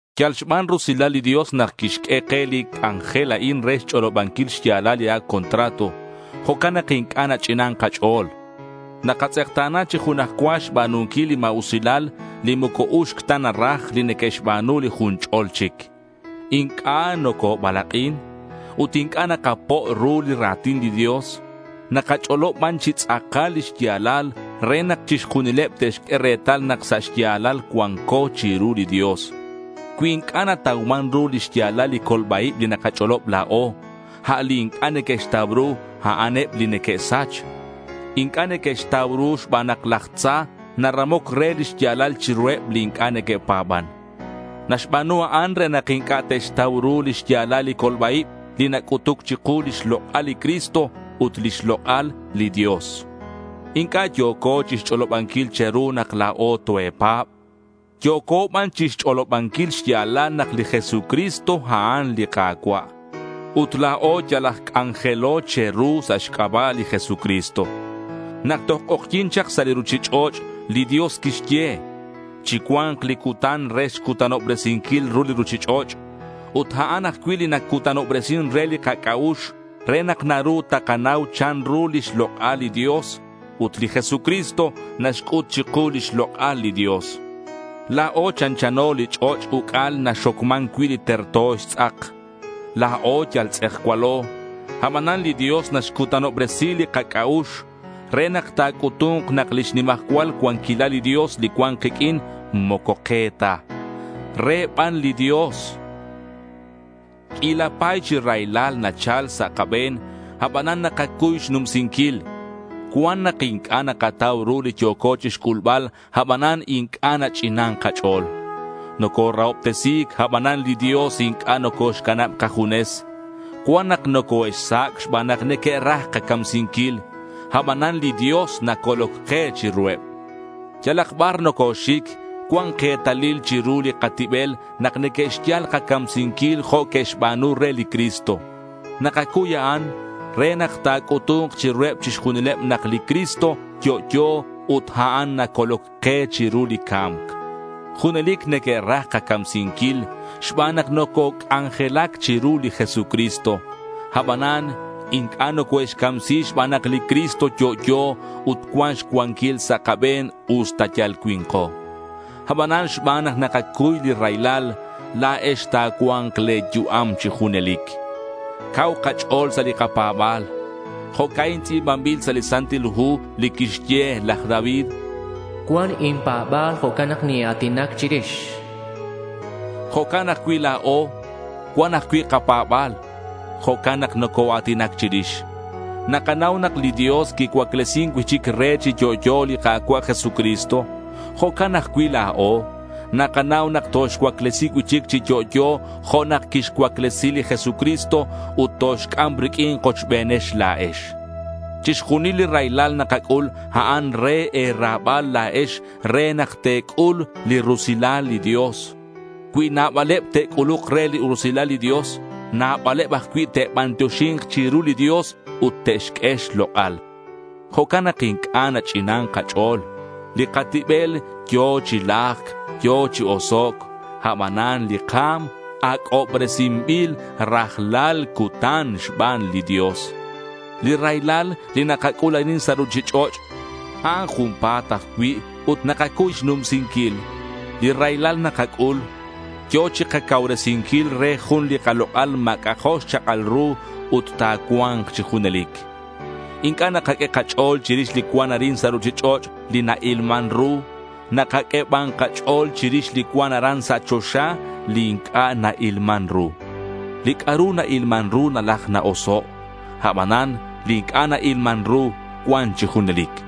Yal xban rusilal li Dios nak quixq'ue ke li c'anjel a'in re xch'olobanquil xya̱lal li ac' contrato. Jo'can nak inc'a' nach'inan kach'o̱l. Nakatz'ekta̱na chi junaj cua xba̱nunquil li ma̱usilal li moco uxc ta naraj li neque'xba̱nu li jun ch'ol chic. Inc'a' nocobalak'in. Ut inc'a' nakapo' ru li ra̱tin li Dios. Nakach'olob ban chi tz'akal li xya̱lal re nak chixjunileb te'xq'ue retal nak sa' xya̱lal cuanco chiru li Dios. Cui inc'a' natauman ru li xya̱lal li colba-ib li nakach'olob la̱o, a' li inc'a' neque'xtau ru, a'an eb li neque'sach. Inc'a' neque'xtau ru xban nak laj tza naramoc re lix ya̱lal chiruheb li inc'a' neque'pa̱ban. Naxba̱nu a'an re nak inc'a' te'xtau ru li xya̱lal li colba-ib li nac'utuc chiku lix lok'al li Cristo, ut lix lok'al li Dios. Inc'a' yo̱co chixch'olobanquil che̱ru nak la̱o toe̱pa̱b. Yo̱co ban chixch'olobanquil xya̱lal nak li Jesucristo a'an li Ka̱cua'. Ut la̱o yal aj c'anjelo che̱ru sa' xc'aba' li Jesucristo. Nak toj k'ojyi̱n chak ru li ruchich'och', li Dios quixye, “Chicua̱nk li cutan re xcutanobresinquil ru li ruchich'och'.” Ut a'an ajcui' li nacutanobresin re li kac'a'ux re nak naru takanau chanru lix lok'al li Dios. Ut li Jesucristo naxc'ut chiku lix lok'al li Dios. La̱o chanchano li ch'och' uc'al li naxocman cui' li terto xtz'ak. La̱o yal tz'ejcualo. Abanan li Dios naxcutanobresi li kac'a'ux re nak ta̱c'utu̱nk nak lix nimajcual cuanquilal li Dios li cuan kiq'uin, moco ke ta. Re ban li Dios. Q'uila pa̱y chi raylal nachal sa' kabe̱n, abanan nakacuy xnumsinquil. Cuan nak inc'a' nakatau ru li yo̱co chixc'ulbal abanan inc'a' nach'inan kach'o̱l. Nocorahobtesi̱c, abanan li Dios inc'a' nocoxcanab kajunes. Cuan nak nocoe'xsac' xban nak neque'raj kacamsinquil. Abanan li Dios nacoloc ke chiruheb. Yalak bar nocoxic cuan ketalil chiru li katibel nak neque'xyal kacamsinquil jo' que'xba̱nu re li Cristo. Nakacuy a'an re nak ta̱c'utu̱nk chiruheb chixjunileb nak li Cristo yo'yo ut a'an nacoloc ke chiru li ca̱mc. Junelic neque'raj kacamsinquil xban nak nococ'anjelac chiru li Jesucristo. Abanan inc'a' nocoe'xcamsi xban nak li Cristo yo'yo ut cuan xcuanquil sa' kabe̱n usta yal cui̱nko. Abanan xban nak nakacuy li raylal, la̱ex ta̱cua̱nk le̱ yu'am chi junelic. Cau kach'o̱l sa' li kapa̱ba̱l. Jo'ca'in tz'i̱banbil sa' li Santil Hu li quixye laj David. “Cuan inpa̱ba̱l. Jo'can nak nina̱tinac chirix”, chan. Jo'can ajcui' la̱o, cuan ajcui' kapa̱ba̱l. Jo'can nak nocoa̱tinac chirix. Nakanau nak li Dios quicuaclesin cui'chic re chi yo'yo li Ka̱cua' Jesucristo. Jo'can ajcui' la̱o. Nakanau nak toxcuaclesi cui'chic chi yo'yo jo' nak quixcuaclesi li Jesucristo ut toxc'am riq'uin kochbenakex la̱ex. Chixjunil li raylal nakac'ul, a'an re e̱ra̱bal la̱ex re nak te̱c'ul li rusilal li Dios. Cui nabaleb te'c'uluk re li rusilal li Dios, nabaleb ajcui' te'bantioxi̱nk chiru li Dios ut te'xq'ue xlok'al. Jo'can nak inc'a' nach'inan kach'o̱l. Li katibel yo̱ chi lajc, yo̱ chi osoc'. Abanan li ka̱m ac'obresinbil rajlal cutan xban li Dios. Li raylal li nakac'ul arin sa' ruchich'och', a'an junpa̱t ajcui' ut nakacuy xnumsinquil. Li raylal nakac'ul, yo̱ chikacauresinquil re jun li kalok'al ma̱c'a' jo' xchak'al ru ut ta̱cua̱nk chi junelic. Inc'a' nakaq'ue kach'o̱l chirix li cuan arin sa' ruchich'och', li na-ilman ru. Nakaq'ue ban kach'o̱l chirix li cuan aran sa' choxa, li inc'a' na-ilman ru. Li c'a'ru na-ilman ru nalaj na-oso'. Abanan li inc'a' na-ilman ru cuan chi junelic.